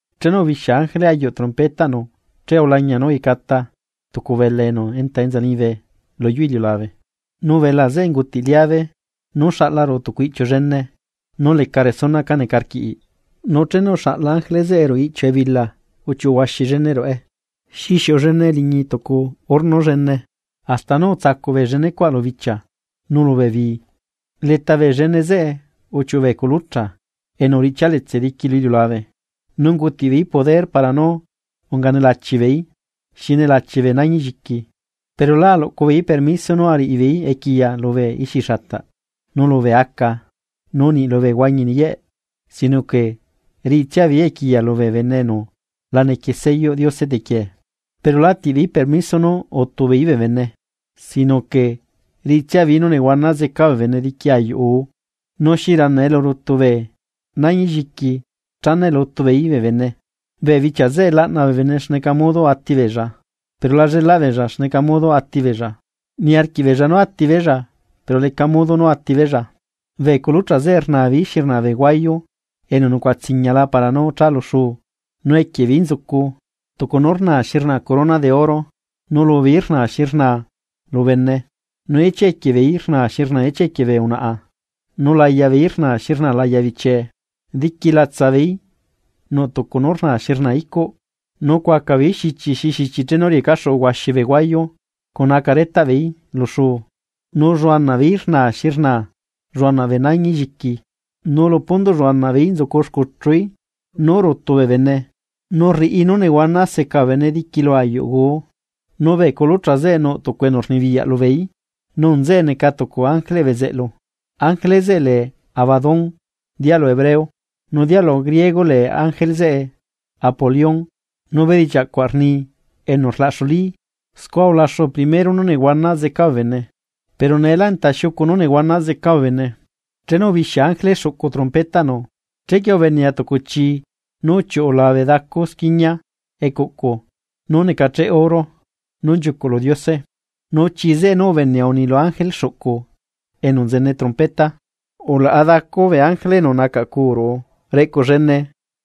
Chenu ubixia ángele ayuꞌ trompetaꞌnu che ulañia nú uyecata tucu belaa enu enta enza liñibe luyuu iliulabe, nu belaa zeꞌe ungutiꞌ liabe nú xaꞌla ruꞌu tucu iꞌchiu llene nú leca resuna cá neca rquiꞌ. Nu chenu uxaꞌla ángele zeꞌe ruꞌu iꞌchiu ebila uchiuꞌu huaxi llene ruꞌe xi xiuꞌu llene liñi tucu horno llene, hasta nú utsacuꞌ bee llenecuaꞌ lu bichia nu lubee bii. Leta llene zeꞌe uchiuꞌu bee culucha enu uriꞌchialetse diqui lu iliulabe nu ungutiꞌ beeí poder para nú unga nelachi beeí, xi nelachi bee nañi lliqui. Pero lá aluꞌcubeeí permiso nú ariꞌi beei equiya lubee ixixata nu lubee aca nu niꞌ lubee huañi niyeꞌ, sino que riꞌitsia beeí equiya lubee bene enu la nequie selloꞌ Diose tequiee. Pero lá atiꞌbeeí permiso nú úti beei bee bene, sino que riꞌitsia beeí nú nehuana zeca bee bene diqui ayuꞌ guu. Nu xi rana elu rutu bee nañilliqui chana elu utubeeí bee bene. Bee bichia zeꞌe laꞌna bee bene xneca modo atibeella, pero la llelaꞌ beella xneca modo atibeella, niarquiꞌbeella nú atibeella, pero leca modo nú atibeella. Bee culucha zeꞌe rna beei xi rnaa bee huayu enu nucuaꞌa tsiñiala para nú cha lu xuu, nu equie beei nzucu tucu nú rnaa xi rnaa corona de oro, nu lubeeí rnaa xi rnaa lu bene. Nu ichia equie beeí rnaa xi rnaa ichia equie bee unaꞌa, nu laya beeí rnaa xi rnaa laya bichie. Diqui latsa beeí nuꞌ tucu nú rnaa xi rnaa icuꞌ, nu cuaca beeí xichi xi xichi chenu riecaxuꞌu huaxi bee huayu cuna aca retaꞌbeeí lu xuu. Nu lluanaꞌ beeí rnaa xi rnaa lluanaꞌ bee nañi lliqui, nu lu pundoꞌ lluanaꞌ beeí nzucu xcuchuí nú rutu bee bene nu rriꞌi nú nehuana seca bee bene diqui lu ayuꞌ guu. Nu bee culucha zeꞌe nuꞌ tucu enu rnibiyaꞌ lubeeí, nu nzeꞌe neca tucu ángeleꞌ bezeꞌlu, ángele zeꞌe lee Abadón dialu hebreo, nu dialu griego lee ángele zeꞌe Apolión nu bedichiaꞌ cuaꞌ rni enu rlaꞌxulí. Scua ulaxu primero nú nehuana zeca bee bene, pero neelá enta xiucu nú nehuana zeca bee bene. Chenu ubixia ángele xuꞌcu trompetaꞌnu, chequie ubenea tucu chi nú uchiuꞌu labe dacu squiñia ecuꞌcu nú necacheꞌ oro nú nchiucuꞌ lu Diose. Nu chii zeꞌe nú ubenea uni lu ángele xuꞌcu enu nzene trompeta: ―Ulaꞌa dacu bee ángele enu nacaꞌcuu ruꞌu reꞌcu llene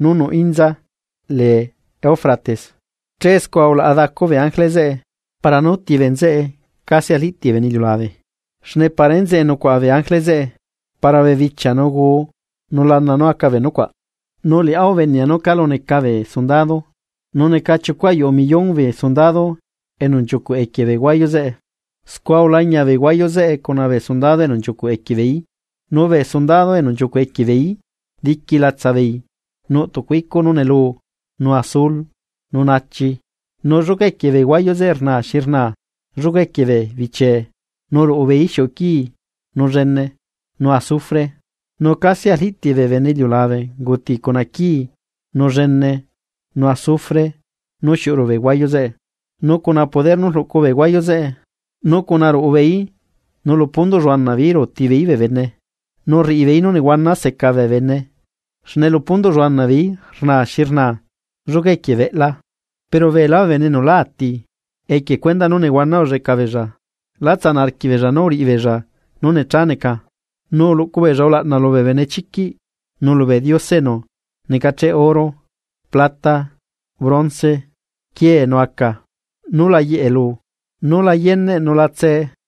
nú nuꞌ inza nú lee Eufrates. Che scua ulaꞌa dacu bee ángele zeꞌe para nú uti bee nzeꞌe casi arliꞌtiꞌ bee bene iliulabe xne para enzeꞌe nucuaꞌa bee ángele zeꞌe para bee bichia nu guu nu lana nú aca bee nucuaꞌ. Nu liꞌá ubenea nú calu neca bee sundado, nu neca chiucu ayuꞌu millón bee sondado enu nchiucuꞌ equie bee huayu zeꞌe. Scua ulañia bee huayu zeꞌe cuna bee sundado enu nchiucuꞌ equie beeí. Nu bee sundado enu nchiucuꞌ equie beeí diqui latsabeei nuꞌ tucu icuꞌ nú neluu, nu azul, nu naachi, nu lluca equie bee huayu zeꞌe rnaa xi rnaa lluca equie bee bechiee nu ruꞌu beeí xiuꞌu quii, nu llene, nu azufre. Nu casi arliꞌtiꞌ bee bene iliulabe unguti cuna quii nu llene nu azufre nú xiuꞌu ruꞌu bee huayu zeꞌe. Nu cuna poder nú rluꞌcu bee huayu zeꞌe nu cuna ruꞌu beeí nu lu pundoꞌ lluanaꞌ beeí ruuti beeí bee bene nu rriꞌi beeí nú nehuana seca bee bene, xne lu pundoꞌ lluanaꞌ beeí rnaa xi rnaa lluca equie beꞌla. Pero beelá bee bene enu lá ati, equie cuendaꞌ nú nehuana ulleꞌca beella, lá tsanaꞌ arquiꞌbeella nú uriꞌibeella nú necha neca, nu uluꞌcu beella ulaꞌna lubee benechiquiꞌ nu lubee diose enu necacheꞌ oro, plata, bronce, quiee nu aca, nú la yeꞌe lu, nú la yeneꞌ nu la tsee.